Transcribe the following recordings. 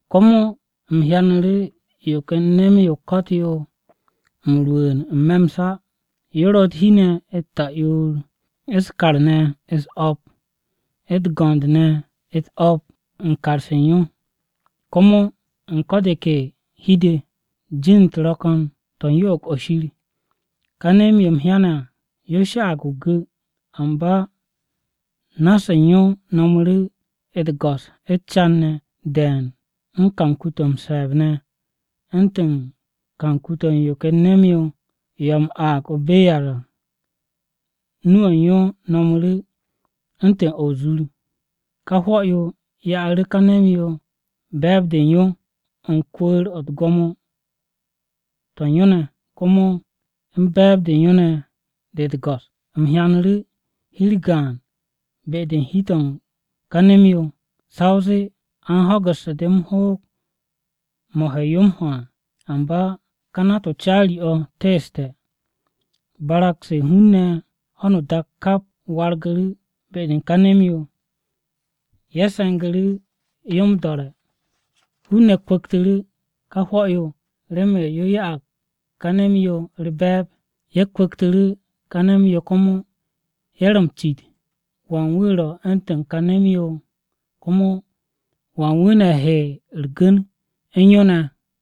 Komo u̱m hyanu̱ru̱ yo ken nem-yo o-ko̱t yo m-rwu̱u̱n n-me̱ m-sa. Yo ro̱ u̱t-hi ne̱ u̱t-ta'yoor, u̱s-kar ne̱ u̱s-o̱p, u̱t-go̱nd ne̱ u̱t-o̱p u̱n kar-se u̱n yo. Komo u̱n ko̱ de ke hi-de, jin-u̱t ro̱ ko̱n to̱ u̱n yo'og-o̱ Shir. Ka nem-yo u̱m hyane̱ à yo sha'ag o-gu̱, amba na-se u̱n yo nomu̱ru̱ u̱t-go̱s u̱s-càn ne̱ de̱e̱n u̱n kanku-to̱ m-se̱e̱b ne̱ u̱ntu̱n kanku-to̱ u̱n yo ken nem-yo, yo a m-aag o-beyar à. Nu-o̱ u̱n yo no̱mu̱ru̱ u̱ntu̱n o̱ o-zur! Ká hwo̱-yo ya'asu̱ ka nem-yo be̱e̱b-de u̱n yo, u̱n kwu̱u̱r-o̱ u̱n gwo̱mo-to̱ u̱n yo ne̱, komo u̱n be̱e̱b-de u̱n yo ne̱ de u̱t-go̱s. U̱m hyanu̱ru̱ hi-u̱r gaan be-de u̱n hi-to̱ u̱n ka nem-yo, sa o zee a u̱n ho̱gu̱ssu̱ de m-hoog mo̱ he yo m-ho à, amba ká nat-o caari-o̱ teeste̱. Barag-se u̱n hun-ne̱ u̱n ho̱no o-dak kap wargu̱ be-de u̱n ka nem-yo, ye̱ se̱ngu̱ yo m-do̱re̱. Hun-ne̱ kwu̱ktu̱ru̱ ka hwo̱-yo remen yo ya'ag ka nem-yo u̱r-be̱e̱b. Ye̱ kwu̱ktu̱ru̱ ka nem-yo komo, ye̱ ro̱ m-cit, “¿Wan wu̱ ro̱ u̱ntu̱n ka nem-yo? Komo ¿wan wu̱ ne̱ he u̱r-gu̱n u̱n yo ne̱?”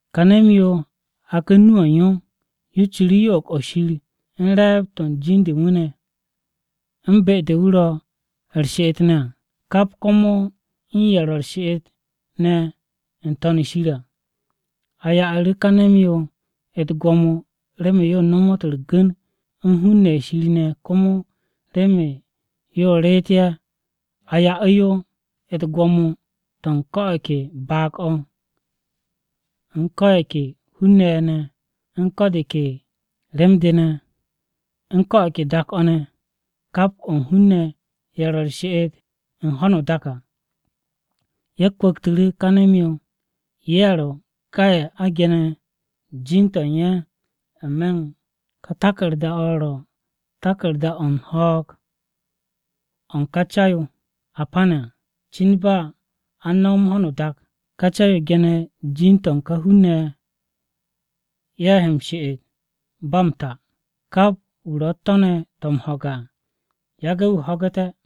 Ka nem-yo haku̱ nu-o̱ u̱n yo, yo ciru̱ yo'og-o̱ Shir u̱n re̱e̱b-to̱ u̱n jin-de u̱n wu̱ ne̱, u̱n be-de wu̱ ro̱ u̱r-she'et ne̱ à, kap komo u̱n ye̱ ro̱ u̱r-she'et n-To̱n shir ne̱ à. A ya'u̱ru̱ ka nem-yo u̱t-gwo̱mo remen yo nomot u̱r-gu̱n u̱n hun-ne̱ ye̱ Shir ne̱ komo remen yo reet ye̱. A ya'u̱ yo u̱t-gwo̱mo to̱ u̱n ko̱ o̱ ke baag-o̱, u̱n ko̱ ye̱ ke hun-ne̱ ye̱ ne̱, u̱n ko̱ de ke rem-de ne̱, u̱n ko̱ o̱ ke dak-o̱ ne̱. Kap o̱ u̱n hun-ne̱ ye̱ ro̱ u̱r-she'et u̱n ho̱no o-dak à ye̱ kwu̱ktu̱ru̱ ka nem-yo. Ye̱ ro̱ ka ye̱ a ge̱ne̱ jin-to̱ u̱n ye̱ n-me̱ u̱n ka taku̱rda-o̱ á. Ka taku̱rda-o̱ ro̱ taku̱rda-o̱ u̱n ho̱o̱g o̱ u̱n ká Ya o-Rwu̱u̱g o-Ca a pane̱ à. Cin ba a u̱n no̱m ho̱no o-dak, ká Ca-yo ge̱ne̱ jin-to̱ u̱n ká hun-ne̱ ye̱, ye̱ he m-she'et ba m-ta à. Kap wu̱ ro̱ u̱t-to̱ ne̱ to̱ m-ho̱ge̱ à, yage̱ wu̱ ho̱ge̱té̱!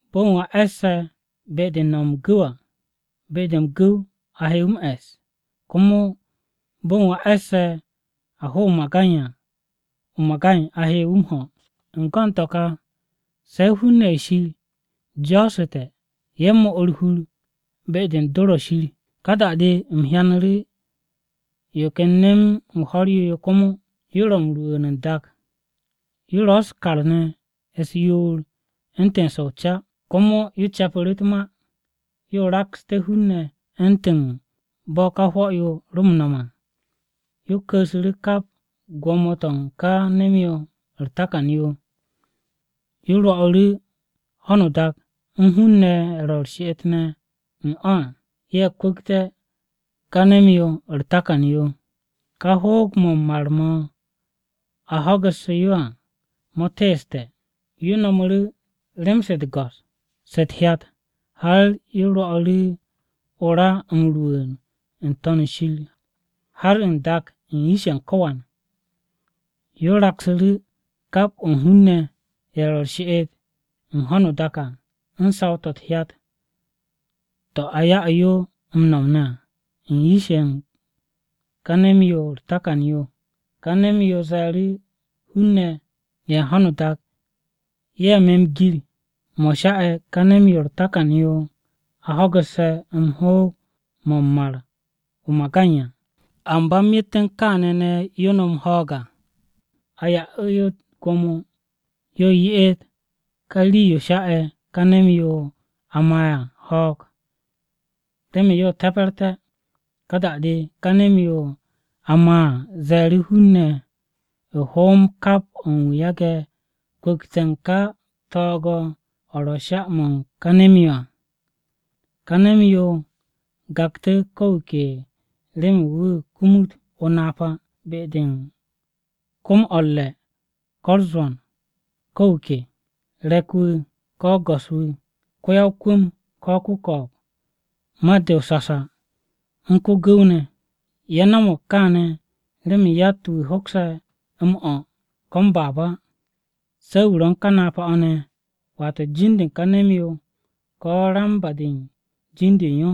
Bo̱n wu̱ a e̱sse̱ be-de u̱n no̱m m-gu̱w à, be-de m-gu̱w a he wu̱ m-e̱s. Komo bo̱ u̱n wu̱ a e̱sse̱ a ho̱ o-magay à, o-magay a he wu̱ m-ho. U̱n go̱n to̱ ka se̱ hun-ne̱ ye̱ Shir jo̱o̱su̱te̱ ye̱ 'mo u̱r-hur be-de u̱n dor-o̱ Shir. Ka da-de u̱m hyanu̱ru̱ yo ken nem-o ho̱r-yo yo komo, yo ro m-rwu̱u̱n n-dak à. Yo ro̱ u̱s-kar ne̱ u̱s-yoor u̱ntu̱n se o-ca, komo yo ce̱pu̱ru̱ u̱t-ma, yo rakste̱ hun-ne̱ u̱ntu̱n bo̱ ka hwo̱-yo ro m-no̱m à. Yo ku̱u̱su̱ru̱ kap gwo̱mo-to̱ u̱n ka nem-yo u̱r-takan yo. Yo rwo'u̱ru̱ ho̱no o-dak u̱n hun-ne̱ ne̱ ye̱ ro̱ u̱r-she'et n-me̱ u̱n o̱ à, ye̱ kwu̱kte̱ ka nem-yo u̱r-takan yo, yo hoog-mo̱ m-mar mo̱ a ho̱gu̱sse̱ yo teese̱ à. Yo no̱mu̱ru̱ rem-se u̱t-go̱s se u̱t-hyat, har yo rwo̱'u̱ru̱ o-ra m-rwu̱u̱n n-To̱n shir har n-dak u̱n yish-ye̱ u̱n ko̱wan. Yo raksu̱ru̱ kap o̱ u̱n hun-ne̱ ye̱ ro̱ u̱r-she'et u̱n ho̱no o-dak à u̱n saw-to̱ u̱t-hyat to̱ a ya'u̱ yo m-nom à u̱n yish-ye̱ u̱n ka nem-yo u̱r-takan yo. Ka nem-yo ze̱e̱ru̱ hun-ne̱ ye̱ u̱n ho̱no o-dak ye̱ me to̱o̱g, o̱ sha'e̱ ka nem-yo u̱r-takan yo yo a ho̱gu̱sse̱ m-hoog mo̱ m-mar o-magay à, amba myet u̱n kaane̱ ne̱ yo nom ho̱o̱g à. A ya'u̱ yo u̱t-gwo̱mo yo ye'et ka rii-yo sha'e̱ ka nem-yo a maa à ho̱o̱g, remen yo te̱pe̱rté̱. Ka da-de ká nem-yo a maa à ze̱e̱ru̱ hun-ne̱ hoom kap o̱ u̱n wu̱ yage̱ kwu̱kte̱ u̱n ká to̱o̱g-o̱ ro̱ sha-mo̱ u̱n ká nem-yo à. Ka nem-yo gakte̱ ko̱ wu̱ ke remen wu̱ kumut o-napa be-de u̱n kom-o̱ u̱r-re̱ ko̱ u̱r-zwo̱n. Ko̱ wu̱ ke: re̱k-wu̱, ko̱ go̱s-wu̱, ko-ya-o-kwu̱m, ko̱ ko-ko̱o̱b, mat-de o-sasa u̱n ko-gu̱w ne̱. Ye̱ no̱mo̱g kaane̱ remen yatt-wu̱ hoksé̱ m-o̱ ko̱ m-baab á se̱ wu̱ ro̱ u̱n ka napa-o̱ ne̱, wata jin-de u̱n ká nem-yo ko̱ ramba-de u̱n jin-de u̱n yo.